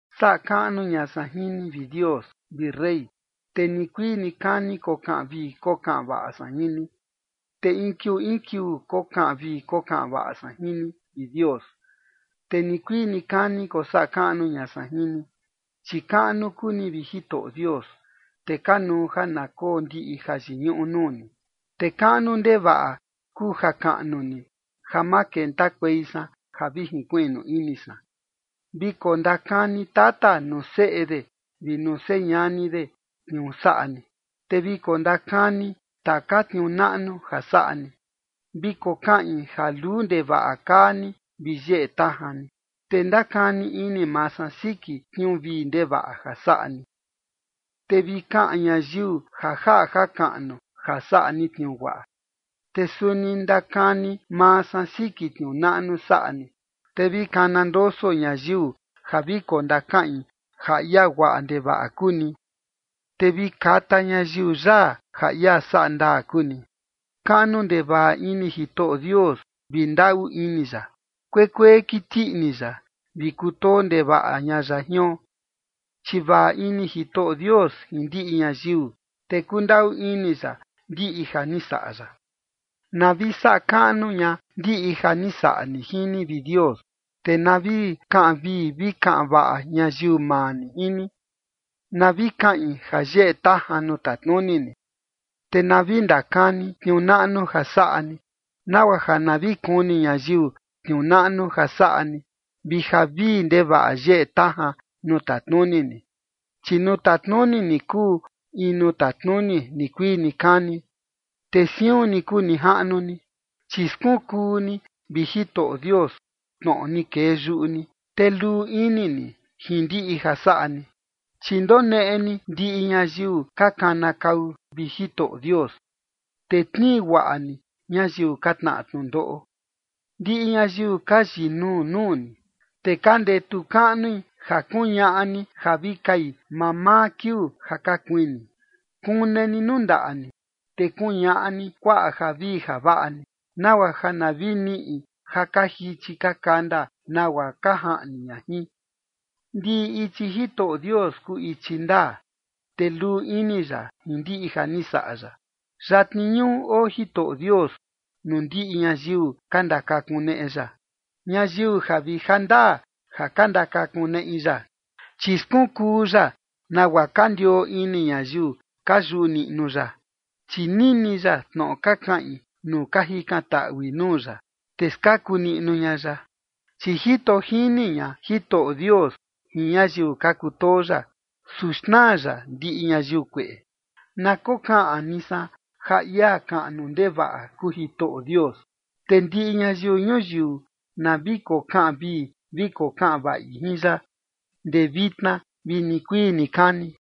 Saꞌa kaꞌnu ña san jin ni, vi Dios, vi rey, te nikuii nikani kokaꞌan vii kokaꞌan vaꞌa san jin ni. Te in kiuu in kiuu kokaꞌan vii kokaꞌan vaꞌa san jin ni, vi Dios, te nikuii nikani kosaꞌa kaꞌnu ña san jin ni. Chi kaꞌnu kuu ni, vi Jitoꞌo Dios, te kanuu ja na koo ndiꞌi jayiñuꞌu nuu ni. Te kaꞌnu ndevaꞌa kuu jakaꞌnu ni ja ma kentakuei san ja vi jinkuiꞌnu ini san. Vi kondakani tata nuu seꞌe de vi nuu señani de tniuu saꞌa ni, te vi kondakani taka tniuu naꞌnu ja saꞌa ni. Vi kokaꞌin ja luu ndevaꞌa kaa ni vi yeꞌe tajan ni, te ndakani ini maa san siki tniuu vii ndevaꞌa ja saꞌa ni. Te vi kaꞌan ñayiu ja jaꞌa jakaꞌnu ja saꞌa ni tniuu guaꞌa, te suni ndakani maa san siki tniuu naꞌnu saꞌa ni. Te vi kana ndoso ñayiu ja vi kondakaꞌin ja ia guaꞌa ndevaꞌa kuu ni, te vi kata ñayiu yaa ja ia saꞌa ndaa kuu ni. Kaꞌnu ndevaꞌa ini Jitoꞌo Dios vi ndaꞌu ini ya. Kuekuee kiti ini ya, vi kutoo ndevaꞌa ña ya jion. Chi vaꞌa ini Jitoꞌo Dios jin ndiꞌi ñayiu, te kundaꞌu ini ya ndiꞌi ja ni saꞌa ya. Na vi saꞌa kaꞌnu ña ndiꞌi ja ni saꞌa ni jin ni, vi Dios, te na vi kaꞌan vii vi kaꞌan vaꞌa ñayiu maa ni jin ni. Na vi kaꞌin ja yeꞌe tajan nuu tatnuni ni, te na vi ndakani tniuu naꞌnu ja saꞌa ni, nagua ja na vi kuni ñayiu tniuu naꞌnu ja saꞌa ni, vi ja vii ndevaꞌa yeꞌe tajan nuu tatnuni ni. Chi nuu tatnuni ni kuu in nuu tatnuni nikuii nikani, te siun ni kuu nijaꞌnu ni, [chi skunkuu ni, vi Jitoꞌo Dios, tnoꞌo ni kee yuꞌu ni, te luu ini ni jin ndiꞌi ja saꞌa ni]. Chi ndoneꞌe ni ndiꞌi ñayiu ka kanakau, vi Jitoꞌo Dios, te tnii guaꞌa ni ñayiu ka tnaꞌa tnundoꞌo. Ndiꞌi ñayiu ka yinuu nuu ni, te ka ndetu kaꞌnui ja kuñaꞌa ni ja vi kai mamaa kiuu ja ka kuini. Kune ni nuu ndaꞌa ni, te kuñaꞌa ni kuaꞌa javii javaꞌa ni, nagua ja na vi niꞌi ja ka jichi ka kanda nagua ka jaꞌni ña jin. Ndiꞌi ichi Jitoꞌo Dios kuu ichi ndaa, te luu ini ya jin ndiꞌi ja ni saꞌa ya. Yatni ñuꞌu oo Jitoꞌo Dios nuu ndiꞌi ñayiu ka ndakakuneꞌe ya, ñayiu ja vi jandaa ja ka ndakakuneꞌi ya. Chi skunkuu ya nagua ka ndioo ini ñayiu ka yuꞌu niꞌnu ya, chi nini ya tnoꞌo ka kaꞌin nuu ka jikantaꞌui nuu ya, te skaku niꞌnu ña ya. Chi jito jini ña Jitoꞌo Dios jin ñayiu ka kutoo ya, su xnaa ya ndiꞌi ñayiu kueꞌe. Na kokaꞌan ni san ja ia kaꞌnu ndevaꞌa kuu Jitoꞌo Dios, te ndiꞌi ñayiu ñuyiu na vi kokaꞌan vii vi kokaꞌan vaꞌi jin ya, ndee vitna vi nikuii nikani.